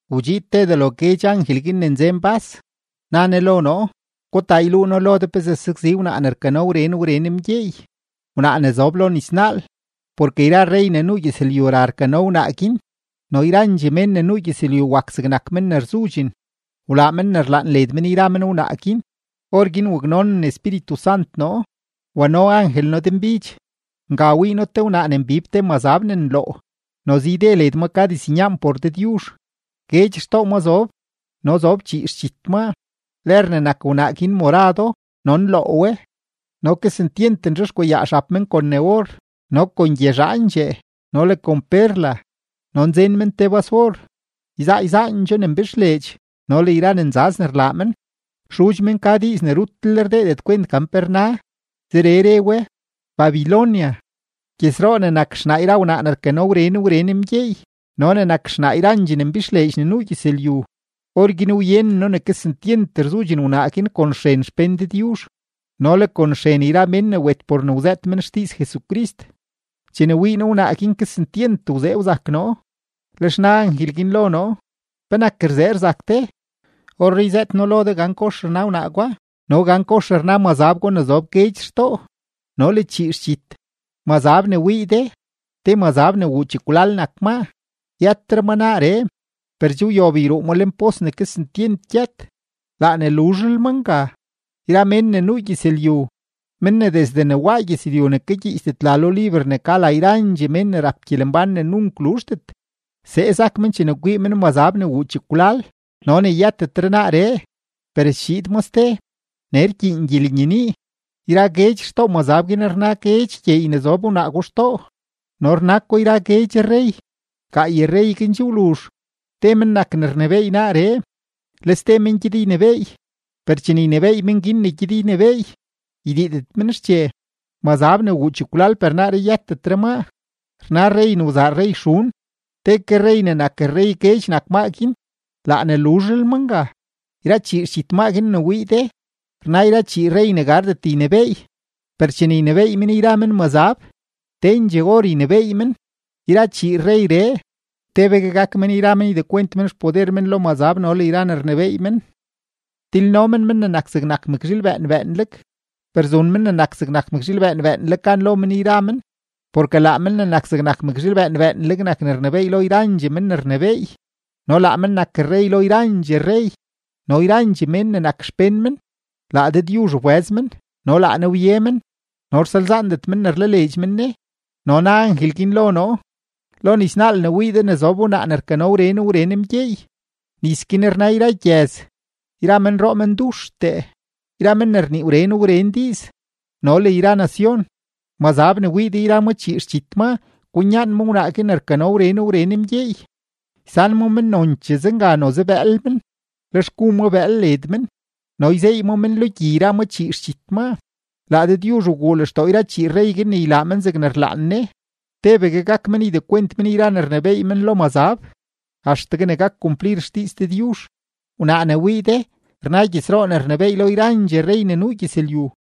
Wdxiid te delo guedx angel ne nzen bas, na ne lo noo: ―Gutaa, yluu noo lo de pezee sakzi wnaa ne rkano wren wren mgyeey, wnaa ne zob lo nisnaal. Porke yra rrey ne nuu gyëzlyu ra rkano wnaa guin, no yrandxee mén ne nuu gyëzlyu wak zegnak men ne rzudxen, wlaa men ne rlaan led men yra men wnaa guin. Orguin waknonen Espíritu Sant noo, wano angel noo denbidx; nga wii noo te wnaa ne mbib te mazab ne nloo; noze yde led ma ka diznyaan por Dëdyuzh, guedx xtoo ma zob no zob chii xdxit maa. Lër ne nak wnaa guin morado no nloo we no kesentyent nzhexkwayaa xab men kon ne or no kon gyezhaandxee no le kon perla, no nzen men te bas-or, yzaa yzaandxoo ne mbixleedx no le yra ne nzaz ne rlaa men. Xudx men ka diiz ne rutlel rdeedet kwent gan pe rna, zeree re we: “Babilonia, gyëzroo ne nak xnaa yra wnaa ne rkano wren wren mgyeey no ne nak xnaa yrandxee ne mbixleedx ne nuu gyëzlyu.” Orguin wyenen noo ne kesentyent rzudxen wnaa guin kon xren xpén Dëdyuzh no le kon xren yra mén ne wet por ne wzëët men xdiiz Jesucrist. Chene wii noo wnaa guin kesentyent wzee wzak noo. Lex na angel guin lo noo: ―¿Penak rzee rzak de? Orree yzëët noo lo de gan kox rna wnaa gwa no gan kox rna mazab gwa ne zob guedx xtoo no le chii xdxit. Mazab ne wii de, te mazab ne wuu chekwlal nak maa, yëtetre ma naaree, per che wyob yruu ma lenpos ne kesentyent gyët, laa ne luzhlel ma nga. Yra mén ne nuu gyëzlyu, men ne desde ne waa gyëzlyu ne kagyiichdet la lo liber ne ka la yrandxee mén ne rap gyelembán ne nunk luzhdet, see sak men chene kwii men mazab ne wuu chekwlal no ne yëtetre naaree, per schiid ma ste. ’Nee rkyiin gyelenyenii: Yra guedx xtoo mazab guin rna guedx gyeey ne zob wnaa gwa xtoo no rna ko yra guedx rrey. Gaay rrey guin che wluzh, te men nak ne rnebééy naaree, le ste men gyed ynebééy; per chene ynebééy men guin ne gyed ynebééy, ydiidet men xche. Mazab ne wuu chekwlal per naaree yëtetre maa, rna rrey ne wzaa rrey xun; te ke rrey ne nak rrey guedx nak maa guin, laa ne luzhlel ma nga. ’Yra chii xdxit maa guin ne wii de, rna yra chii rrey ne gardet ynebééy, per chene ynebééy men yra men mazab, tendxee or ynebééy men. Yra chii rreyree, tebegue gak men yra men ydekwent men xpoder men lo mazab no le yra ne rnebééy men. Tilno men Men ne nak zegnak mëkzhiil bëën bëënleg, per zun Men ne nak zegnak mëkzhiil bëën bëënleg gan lo men yra men, porke laa Men ne nak zegnak mëkzhiil bëën bëënleg nak ne rnebééy lo yrandxee men ne rnebééy, no laa men nak rrey lo yrandxee rrey; no yrandxee mén ne nak xpén men, laa Dëdyuzh wbëz men no laa Ne wye men no rsalzaandet men ne rlaleedx men Ne. No na angel guin lo noo: ―Lo nisnaal ne wii de ne zob wnaa ne rkano wren wren mgyeey, nis guin rna yra gyëz, yra menroo menduxtee, yra men ne rnii wren wren diiz, no le yra nacion. Mazab ne wii de yra ma chii xdxit maa kwinyaan ma wnaa guin ne rkano wren wren mgyeey, ysan ma men nonchee zenga noze bëël men, lex gu ma bëël led men, no yzeey ma men lo gyi yra ma chii xdxit maa. Laa Dëdyuzh wguu lextoo yra chii rrey guin ne ylaa men zegne rlaan Ne, tebegue gak men ydekwent men yra ne rnebééy men lo mazab axtegue ne gak kumplir xdiiz Dëdyuzh. Wnaa ne wii de, rna gyëzroo ne rnebééy lo yrandxee rrey ne nuu gyëzlyu.